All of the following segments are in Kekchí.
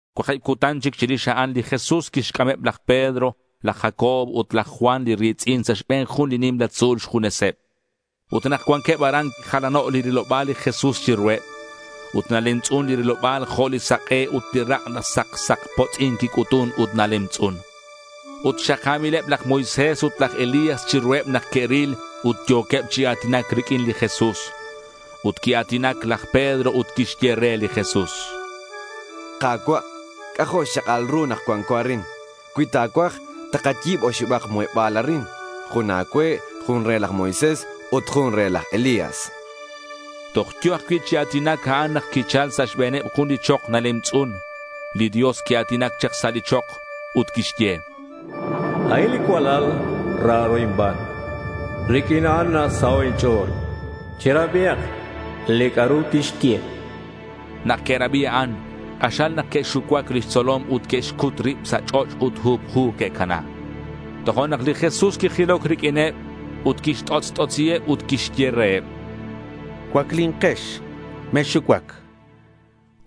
Cuakib cutan chic chirix a'an, li Jesús quixc'ameb laj Pedro, laj Jacobo ut laj Juan li ri̱tz'in sa' xbe̱n jun li nimla tzu̱l xjuneseb. Ut nak cuanqueb aran, quijalano' li riloba̱l li Jesús chiruheb. Ut nalemtz'un li riloba̱l jo' li sak'e ut li rak' saksakpotz'in quic'utun ut nalemtz'un. Ut xaka̱mileb laj Moisés ut laj Elías chiruheb nak que'ril ut yo̱queb chi a̱tinac riq'uin li Jesús. Ut quia̱tinac laj Pedro ut quixye re li Jesús: —Ka̱cua', c'ajo' xchak'al ru nak cuanco arin. Cui ta̱cuaj, takayi̱b oxibak muheba̱l arin. Jun a̱cue, jun re laj Moisés ut jun re laj Elías, chan. Toj yo̱ ajcui' chi a̱tinac a'an nak quichal sa' xbe̱neb jun li chok nalemtz'un. Li Dios quia̱tinac chak sa' li chok, ut quixye: —A'in li cualal raro inban. Riq'uin a'an nasaho' inch'o̱l. Cherabihak li c'a'ru tixye.— Nak que'rabi a'an, k'axal nak que'xucuac lix tzolom ut que'xcut rib sa' ch'och' ut huphu que'cana. Tojo'nak li Jesús quijiloc riq'uineb ut quixt'otz't'otz'iheb ut quixye reheb: —Cuaclinkex. Mexxucuac.—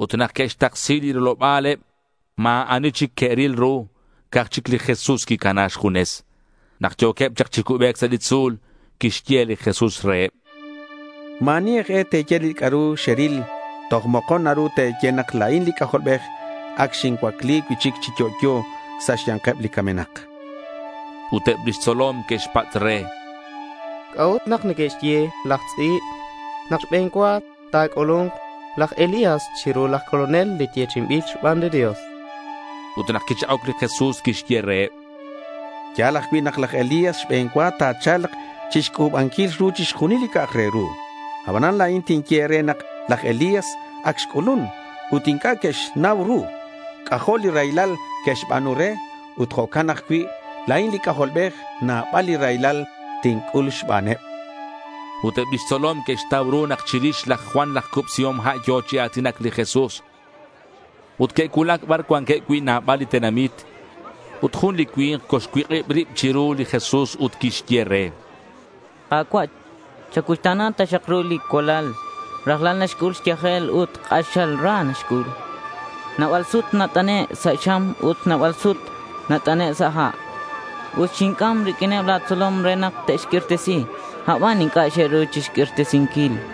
Ut nak que'xtaksi li riloba̱leb, ma̱ ani chic que'ril ru, ca'aj chic li Jesús quicana xjunes. Nak yo̱queb chak chi cubec sa' li tzu̱l, quixye li Jesús reheb: —Ma̱ ani aj e te̱ye li c'a'ru xeril. Toj mokon naru te̱ye nak la̱in li C'ajolbej ac xincuacli cui'chic chi yo'yo sa' xya̱nkeb li camenak.— Ut eb lix tzolom que'xpatz' re: —¿C'a'ut nak neque'xye laj tz'i̱b nak xbe̱n cua ta̱c'ulu̱nk laj Elías chiru laj colonel li yechi'inbil xban li Dios?— Ut nak quichak'oc li Jesús quixye reheb: —Ya̱l ajcui' nak laj Elías xbe̱n cua ta̱cha̱lk chixc'u̱banquil ru chixjunil li c'a'ak re ru. Abanan la̱in tinye e̱re nak laj Elías ac xc'ulun ut inc'a' que'xnau ru. C'ajo' li raylal xe'xba̱nu re ut jo'can ajcui' la̱in li C'ajolbej nabal li raylal tinc'ul xbaneb.— Ut eb lix tzolom que'xtau ru nak chirix laj Juan laj Cubsihom Ha' yo̱ chi a̱tinac li Jesús. Ut que'cuulac bar cuanqueb cui' nabal li tenamit. Ut jun li cui̱nk colxcuik'ib rib chiru li Jesús ut quixye re: —Ka̱cua', chan, chacuuxta̱na taxak ru li cualal. Rajlal nac'ul xyajel, ut k'axal ra naxc'ul. Nabal sut nat'ane' sa' xam ut nabal sut nat'ane' sa' ha'. Ut xinc'am riq'uineb la̱ tzolom re nak te'xq'uirtesi; abanan inc'a' xe'ru xq'uirtesinquil, chan.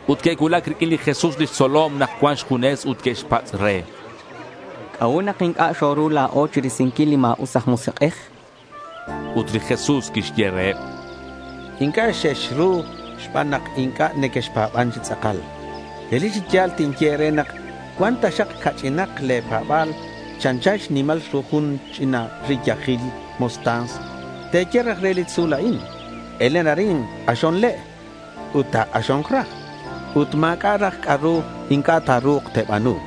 Ut que'cuulac riq'uin li Jesús lix tzolom nak cuan xjunes ut que'xpatz' re: —¿C'a'ut nak inc'a' xoru la̱o chirisinquil li ma̱us aj musik'ej? chanqueb. Ut li Jesús quixye reheb: —Inc'a' xexru xban nak inc'a' nequexpa̱ban chi tz'akal. Relic chi ya̱l tinye e̱re nak cuan taxak ca'ch'inak le̱ pa̱ba̱l chanchan xnimal ru jun ch'ina riyajil mostaza, te̱ye raj re li tzu̱l a'in, “Elen arin, k'axon le'” ut ta̱k'axo̱nk raj. Ut ma̱c'a' raj c'a'ru inc'a' ta̱ru̱k te̱ba̱nu.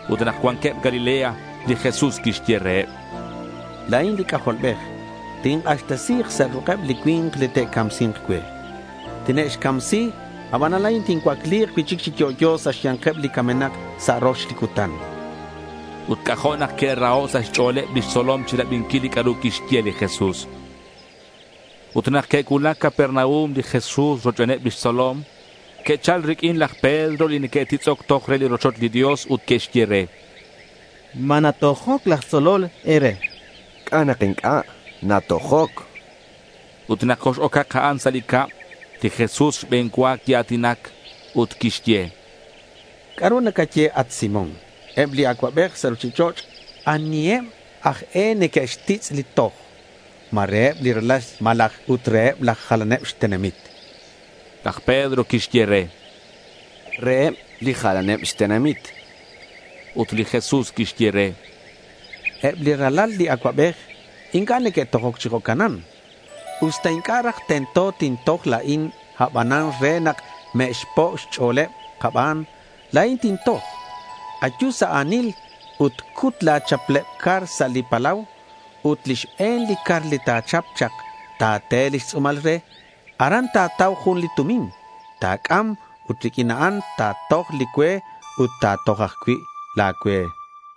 Ut nak cuanqueb Galilea, li Jesús quixye reheb: —La̱in li C'ajolbej tink'axtesi̱k sa' ruk'eb li cui̱nk li te'camsi̱nk cue. Tine'xcamsi, abanan la̱in tincuacli̱k cui'chic chi yo'yo sa' xya̱nkeb li camenak sa' rox li cutan, chan. Ut c'ajo' nak que'raho' sa' xch'o̱leb lix tzolom chirabinquil li c'a'ru quixye li Jesús. Ut nak que'cuulac Capernaum li Jesús rochbeneb lix tzolom, que'chal riq'uin laj Pedro li neque'titz'oc toj re li rochoch li Dios ut que'xye re: —¿Ma natojoc laj tzolol e̱re?— —¿C'a' nak inc'a'? Natojoc, chan laj Pedro. Ut nak cox-ocak a'an sa' cab, li Jesús xbe̱n cua quia̱tinac ut quixye: —¿C'a'ru nacaye at Simón, eb li acuabej sa' ruchich'och', aniheb aj e neque'xtitz' li toj? ¿Ma reheb li ralal malaj ut reheb li jalaneb xtenamit? chan. Laj Pedro quixye re: —Reheb li jalaneb xtenamit.— Ut li Jesús quixye re: —Eb li ralal li acuabej inc'a' neque'tojoc chi jo'canan. Usta inc'a' raj tento tintoj la̱in, abanan re nak me'xpo' xch'o̱leb kaban, la̱in tintoj. Ayu sa' a̱nil ut cut la̱ chapleb car sa' li palau. Ut li xbe̱n li car li ta̱chap chak, ta̱te lix tz'u̱mal re. Aran ta̱tau jun li tumin. Ta̱c'am ut riq'uin a'an ta̱toj li cue ut ta̱toj ajcui' la̱ cue, chan.